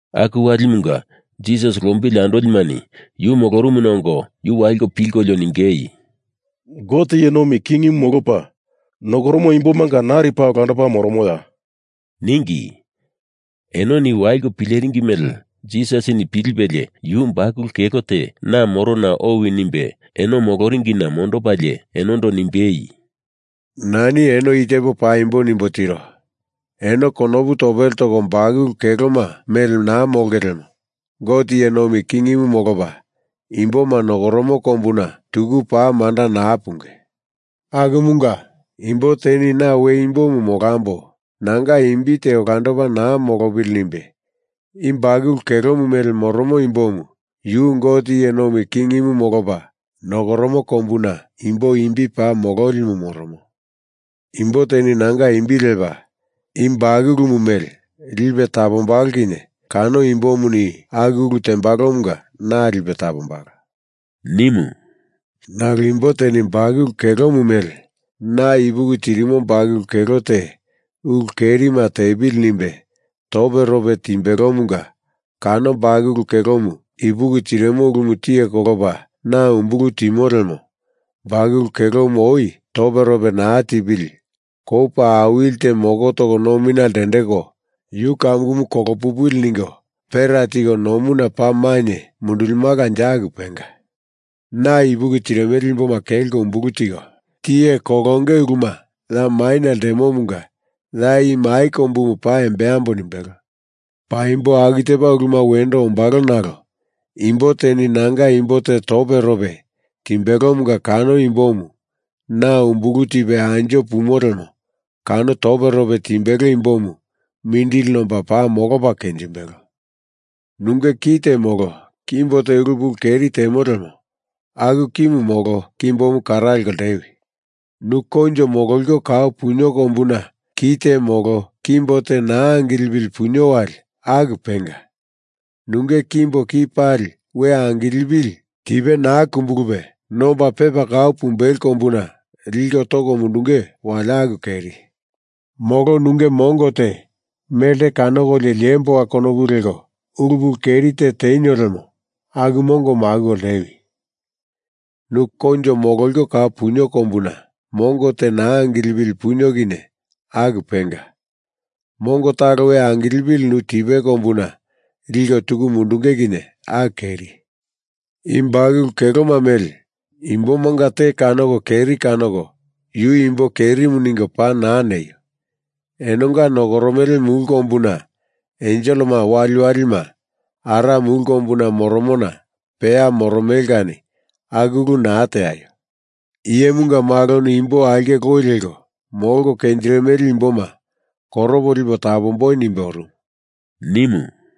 Aku walimunga Jisas lombili andolimani yu molorumuna ongo yu waliko pilkolio ningei, “Gote iye nomi kingimu molopa nokoromo imbomanga nari paa olandopa moromoya?” ningi. Enoni waliko pileringi mele Jisasini pilipelie yu bakulu kelo te na morona owi nimbe eno moloringina mondopalie enondo nimbei, “Nani eno i tepo paimbo nimbo tiro. Eno konopu topele toko bakulu keloma mele naa molonge lemo Gote iye nomi kingimu molopa imboma nokoromo kombuna tuku paa manda naa punge. Akumunga imbo teni na we imbomu molambo, nanga imbi te olandopa naa molopili nimbe i bakulu kelomu mele moromo imbomu yu Gote iye nomi kingimu molopa nokoromo kombuna imbo imbi paa mololimu moromo. Imbo teni nanga imbi lepa i bakulumu mele lipe tapombalo kinye kano imbomuni aku ulu tembalomunga na lipe tapombalo,” nimu “Nalo imbo teni i bakulu kelomu mele na ipuki tirimo bakulu kelo te ulu kerima tepili nimbe toperope timbelomunga kano bakulu kelomu ipuki tirimo ulumu tiye kolopa na umbulu timo lemo bakulu kelomu oi toperope naa tipili kou paa awili te moko toko nomina lendeko yu kamukumu kolo pupili ningo pera tiko nomuna paa mainye mundulimalanje aku penga. Na ipuki tirimele imboma kelko umbulu tiko tiye kolonge uluma ya maina ltemomunga ya i mai kombumu paa embambo nimbelo. Paimbo aku tepa uluma wendo ombalo nalo imbo teni nanga imbo te toperope timbelomunga kano imbomu na umbulu tipe anjo pumo lemo kano toperope timbelo imbomu mindili nomba paa molopa kenjimbelo. Nunge ki te molo kimbo te ulu pulu keri te temo lemo aku kimu molo kimbomu kara leko ltewi. Nu koinjo mololiko kau punio kombuna ki te molo kimbo te naa angilepili punio wali aku penga. Nunge kimbo ki pali we angilipili tipe naa kumbulupe nomba, pepa kau pumbelo kombuna liko toko mundunge wali aku keri. Molo nunge mongo te melte kanokolio liemboa konopu leko ulu pulu keri te tenio lemo aku mongomu akuko ltewi. Nu koinjo mololiko kau punio kombuna mongo te naa angilepili punio kinye aku penga. Mongo talo we angilepili nu tipe kombuna liko tuku mundunge kinye aku keri. I bakulu keloma mele imbomanga te kanoko keri kanoko yu imbo kerimu ningo paa naa neio. Enonga nokoromele mulu kombuna enselema waliwalima Ara mulu kombuna moromona peya moromele kani aku ulu naa teaio. Iyemunga Maloni imbo aulke loi leko molko kenjirimele imboma koropo lipo tapamboi nimbe orumu,” nimu.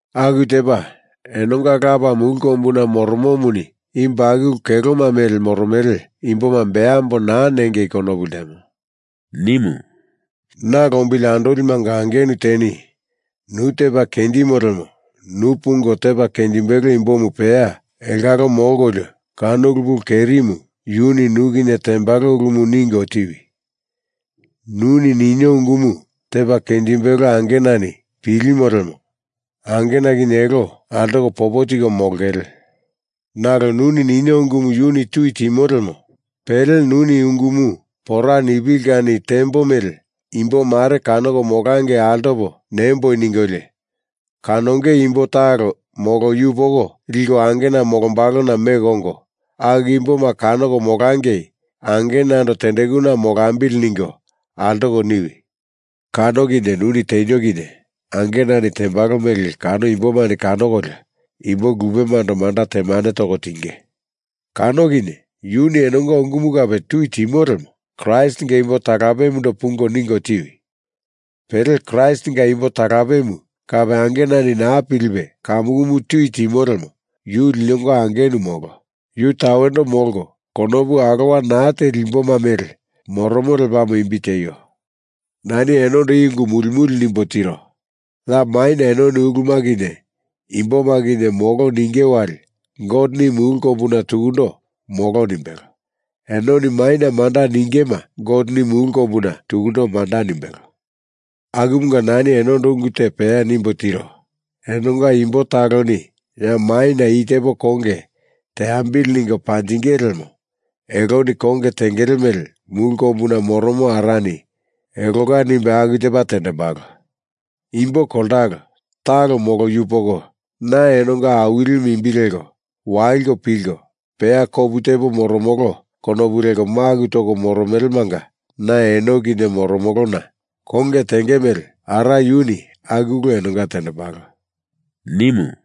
Aku tepa enonga Lapa mulu kombuna moromomuni i bakulu keloma mele moromele imboma beambo naa nengei konopu ltemo,” nimu. “Na lombili andolimanga angenu teni nu tepa kenjimo lemo nu pungo tepa kenjimbelo imbomu peya elongalo molkolio kano ulu pulu kerimu yuni nu kinye tembalo ulumu ningo tiwi. Nuni ninio ungumu tepa kenjimbelo angenani pilimo lemo angena kinye elo altoko popo tiko molongele. Nalo nuni ninio ungumu yu tui timo lemo pele nuni i ungumu pora nipili kani tembo mele imbo mare kanoko molangei altopo nemboi ningolio, kanonge imbo talo molo yupoko liko angena molombalona meko ongo, aku imboma kanoko molangei angenando tendekuna molambili ningo altoko niwi. Kano kinye nuni tenio kinye angenani tembalo mele kano imbomani kanokolio imbo lupemando manda temane toko tinge. Kano kinye yuni enonga ungumu kape tui timo lemo Kraistinga imbo talapemundo pungo ningo tiwi. Pele Kraistinga imbo talapemu kape angenani naa pilipe kamukumu tui timo lemo yu linonga angenu molo, yu tawendo molko konopu alowa naa teli imboma mele moromo lepamo imbi tieio. Nani enondo i ungu muli muli nimbo tiro. Ya maina enoni uluma kinye imboma kinye molo ninge wali Goteni mulu kombuna tukundo molo nimbelo, enoni maina manda ningema Goteni mulu kombuna tukundo manda nimbelo. Akumunga nani enondo ungu te peya nimbo tiro. Enonga imbo taloni ya maina i tepo konge teambili ningo panjingele lemo eloni konge tengele mele mulu kombuna moromo Arani elonga nimbe aku tepa tendembalo. Imbo koltalo, talo molo yupoko, na enonga Awilimu imbi leko waliko pilko, peya kopu tepo moromolo konopu leko maku toko moromelemanga na eno kinye moromolona konge tenge mele Ara yuni aku ulu enonga tendembalo,” nimu.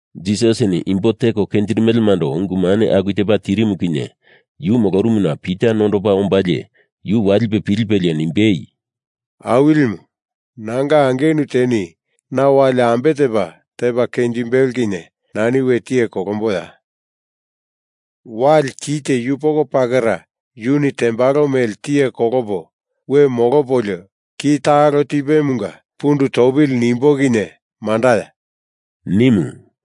Jisasini imbo teko kenjirimelemando ungu mane aku tepa tirimu kinye yu molorumuna Pita nondopa ombalie yu walipe pilipelie nimbei, “Awilimu, nanga angenu teni na wali ambe tepa tepa kenjimbelo kinye nani we tiye kolomboya? Wali ki te yupoko pakera yuni tembalo mele tiye kolopo we molopolio ki talo tipemunga pundu topili nimbo kinye mandaya?” nimu.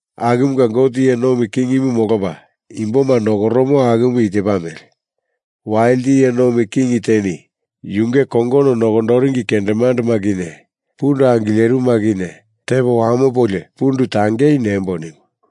Akumunga Gote iye nomi kingimu molopa imboma nokoromo akumu i tepa mele: Walite iye nomi king teni yunge kongono nokondoringi kendemandema kinye pundu angilerimuma kinye tepo wamopolio pundu tangei nembo nimu.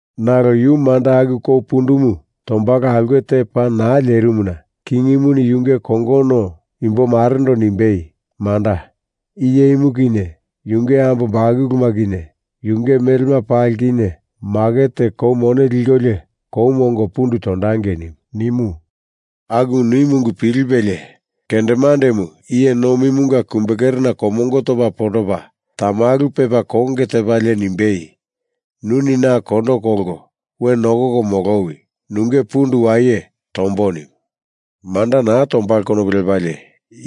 Nalo yu manda aku kou pundumu tombalo aulke te paa naa lerimuna kingimuni yunge kongono imbomarendo nimbei, “Manda, i iyemu kinye yunge ambo bakuluma kinye yunge melema pali kinye maket teko kou mone likolio koumu ongo pundu tondangei,” nimu. Aku nimu ungu pilipelie kendemandemu iye nomimunga kumbekerena komongo topa pondopa tamalu pepa konge tepalie nimbei, “Nuni na kondo kolko we nokoko molowi. Nunge pundu waye tombo,” nimu. Manda naa tombalo konopu lepalie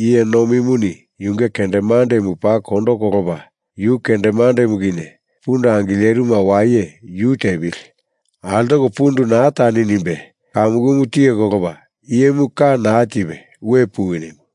iye nomimuni yunge kendemandemu paa kondo kolopa yu kendemandemu kinye pundu angilerimuma waye yu tepili, altoko pundu naa tani, nimbe kamukumu tiye kolopa iyemu ka naa tipe we puwi nimu.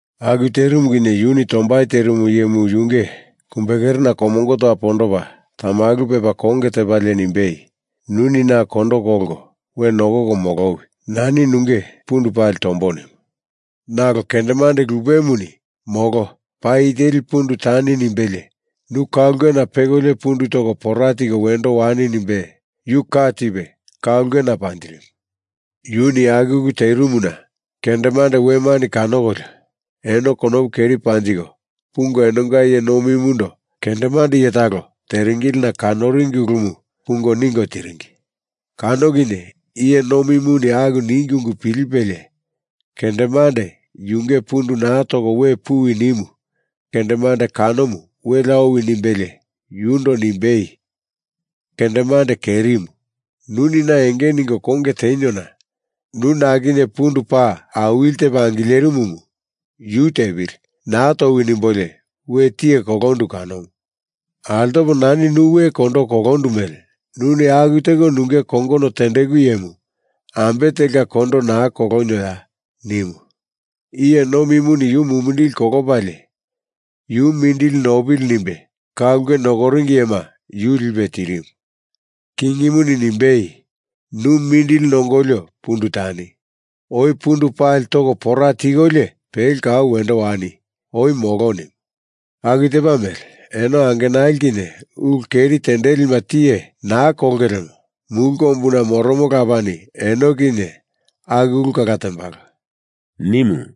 Aku terimu kinye yuni tombai terimu iyemu yunge kumbekerena komongo topa pondopa tamalu pepa konge tepalie nimbei, “Nuni na kondo kolko we nokoko molowi. Nani nunge pundu pali tombo,” nimu. Nalo kendemande lupemuni molo, paa i teli pundu tani nimbelie nu ka ulkena pekolio pundu toko pora tiko wendo wani nimbe yu ka tipe ka ulkena panjirimu. Yuni aku ulu terimuna kendemande wemani kanokolio eno konopu keri panjiko pungo enonga iye nomimundo kendemande iye talo teringilina kanoringi ulumu pungo ningo tiringi. Kano kinye iye nomimuni aku ningi ungu pilipelie kendemande yunge pundu naa toko we puwi nimu kendemande kanomu welea owi nimbelie yundo nimbei, “Kendemande kerimu, nuni na enge ningo konge teniona nu na kinye pundu paa awili tepa angilerimumu yu tepili, naa towi nimbolio we tiye kolondu kanomu. Altopo nani nu we kondo kolondu mele nuni aku teko nunge kongono tendeku iyemu ambe telka kondo naa kolonioya?” nimu. Iye nomimuni yu mumindili kolopalie yu mindili nopili nimbe ka ulke nokoringi iyema yu lipe tirimu. Kingimuni nimbei, “Nu mindili nongolio pundu tani. Oi pundu pali toko pora tikolio pele kau wendo wani. Oi molo,” nimu. Aku tepa mele enoni angenali kinye ulu keri tendilima tiye naa kolonge lemo mulu kombuna moromo Lapani eno kinye aku ulu kala tembalo,” nimu.